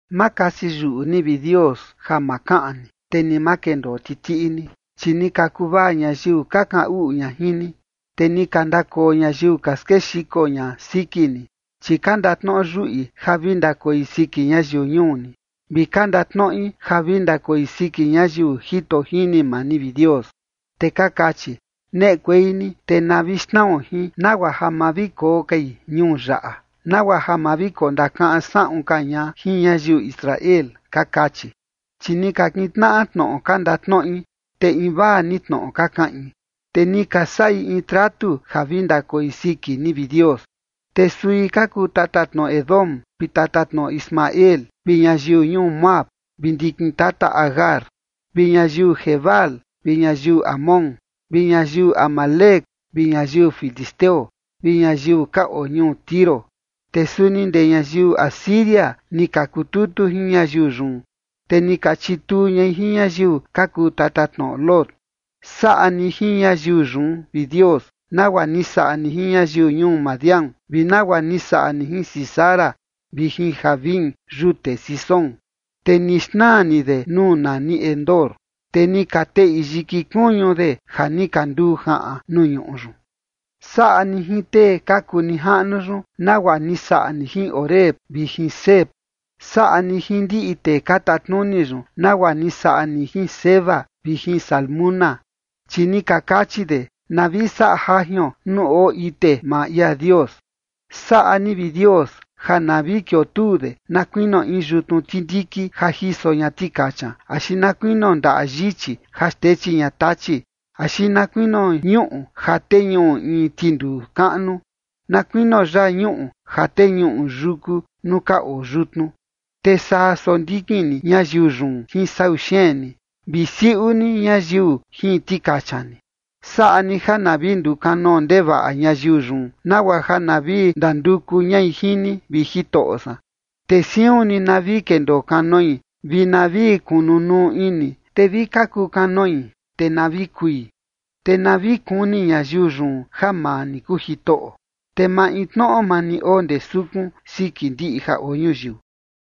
Ma kasi yuꞌu ni, vi Dios, ja ma kaꞌan ni, te ni ma kendoo titiꞌi ni. Chi ni ka kuvaa ñayiu ka kaꞌan uꞌu ña jin ni, te ni ka ndakoo ñayiu ka skexiko ña siki ni. Chi ka ndatnoꞌo yuꞌi ja vi ndakoi siki ñayiu ñuu ni, vi ka ndatnoꞌi ja vi ndakoi siki ñayiu jito jini maa ni, vi Dios. Te ka kachi: “Neꞌekuei ni te na vi xnao jin, nagua ja ma vi koo kai ñuu yaꞌa, nagua ja ma vi kondakaꞌan saꞌun ka ña jin ñayiu Israel”, ka kachi. Chi ni kintnaꞌa tnoꞌo ka ndatnoꞌi, te invaa ni tnoꞌo ka kaꞌin, te ni ka saꞌi in tratu ja vi ndakoi siki ni, vi Dios. Te sui ka kuu tatatnoꞌo Edom vi tatatnoꞌo Ismael, vi ñayiu ñuu Moab vi ndikin tata Agar, vi ñayiu Gebal vi ñayiu Amón, vi ñayiu Amalec, vi ñayiu filisteo vi ñayiu ka oo ñuu Tiro. Te suni ndee ñayiu Asiria ni ka kututu jin ñayiu yun, te ni ka chituu ñai jin ñayiu ka kuu tatatnoꞌo Lot. Saꞌa ni jin ñayiu yun, vi Dios, nagua ni saꞌa ni jin ñayiu ñuu Madián vi nagua ni saꞌa ni jin Sísara vi jin Jabín yute Cisón. Te ni xnaa ni de nuu nani Endor, te ni ka teꞌi yiki kuñu de ja ni ka nduu jaꞌan nuu ñuꞌu yun. Saꞌa ni jin tee ka kuu nijaꞌnu yun nagua ni saꞌa ni jin Oreb vi jin Zeeb. Saꞌa ni jin ndiꞌi tee ka tatnuni yun nagua ni saꞌa ni jin Zeba vi jin Zalmuna, chi ni ka kachi de: “Na vi saꞌa jajion nuu oo ite maa ia Dios”. Saꞌa ni, vi Dios, ja na vi kiotuu de na kuinio in yutnu tindiki ja jiso ña tikacha, axi na kuinio ndaꞌa yichi ja xtechi ña tachi, axi na kuinio ñuꞌu ja teñuꞌu in tinduu kaꞌnu, na kuinio yaa ñuꞌu ja teñuꞌu yúku nuu ka oo yutnu. Te saa sondikin ni ñayiu yun jin sau xeen ni, vi siuꞌu ni ñayiu jin tikacha ni. Saꞌa ni ja na vi ndukanoo ndevaꞌa ñayiu yun, nagua ja na vi ndanduku ñai jin ni, vi Jitoꞌo san. Te siun ni na vi kendoo kanoi vi na vi kunu nuu ini, te vi ka kukanoi, te na vi kui. Te na vi kuni ñayiu yun ja maa ni kuu Jitoꞌo, te maintnoꞌo maa ni oo ndee sukun, siki ndiꞌi ja oo ñuyiu.